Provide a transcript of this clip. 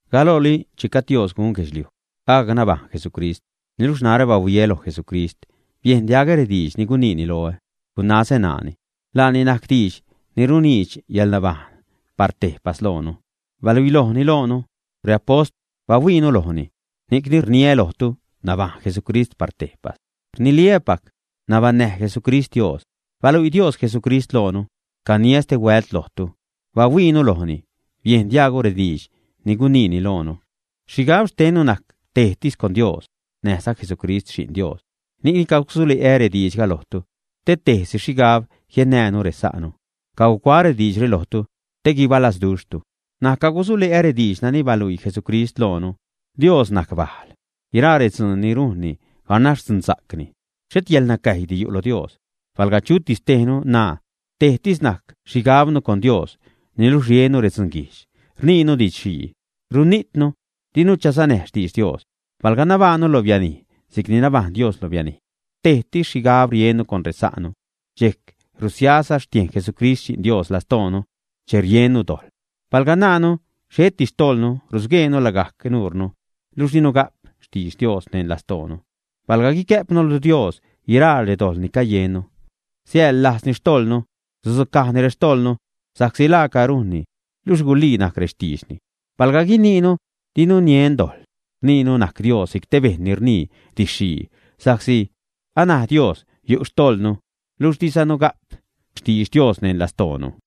Galooli che gajd Dios gun guedxliuj, agac nabajṉ Jesucrist. Niluxh narä bahuiä loj Jesucrist, biejn diagä rediidx ni guniini loä, gunazä ṉaani. Laani najc Diidx ni runiidx yäḻnabajṉ par tejpas loonu. Baluilojni loonu; reapost bahuiinu lojni. Ni'cni rniä lojtu, nabajṉ Jesucrist par tejpas. Rniliä́pac nabaṉnäj Jesucrist Dios. Baluii Dios Jesucrist loonu. Caniä stehuält lojtu, bahuiinu lojni. Biejn diajgnu rediidx ni guniini loonu. Xhigab xtennu najc tejtis con Dios, näjza Jesucrist Xi'n Dios. Ni'cni cagusule'ä rediidxga lojtu, te tejtis xhigab jiennäänu resa'nu. Cagucuaä rediidxre lojtu te guibalazduxhtu. N̲aj cagusule'ä rediidx nani baluii Jesucrist loonu. Dios najc bajl. Guiraa redzuun ni rujnni, ganax dzunsa'cni. Xhet yäḻnacäjydi yu' lo Dios. Palga chutis tejnu naa, tejtis najc xhigabnu con Dios, niluxh riennu redzunguijdx, rniinu didx-xhii, runijtnu dinu chasanäj xtidx Dios. Palga nabajṉnu lo bianij si'cni nabajṉ Dios lo bianij, tejtis xhigab riennu con resa'nu. Dxejc rusiaza xtiejn Jesucrist Xi'n Dios lastoonu che riennu dojḻ. Palga naanu xheti xtojḻnu, rusgueenu lagajc nuunu, luxh dinu ga'p xtidx Dios neṉ lastoonu. Palga guicäjpnu lo Dios guiraa redojḻ ni cayennu, siäḻlajzni xtojḻnu, sudzucajni rextojḻnu, sa'csi laaca rujnni luxh gulii najc rextiidxni. Palga guinuunu dinu niujn dojḻ, rniinu najc Dios si'c te bejṉ ni rnii didx-xhii sa'csi anaj Dios yu' xtojḻnu, luxh dizanu ga'p xtidx Dios neṉ lastoonu.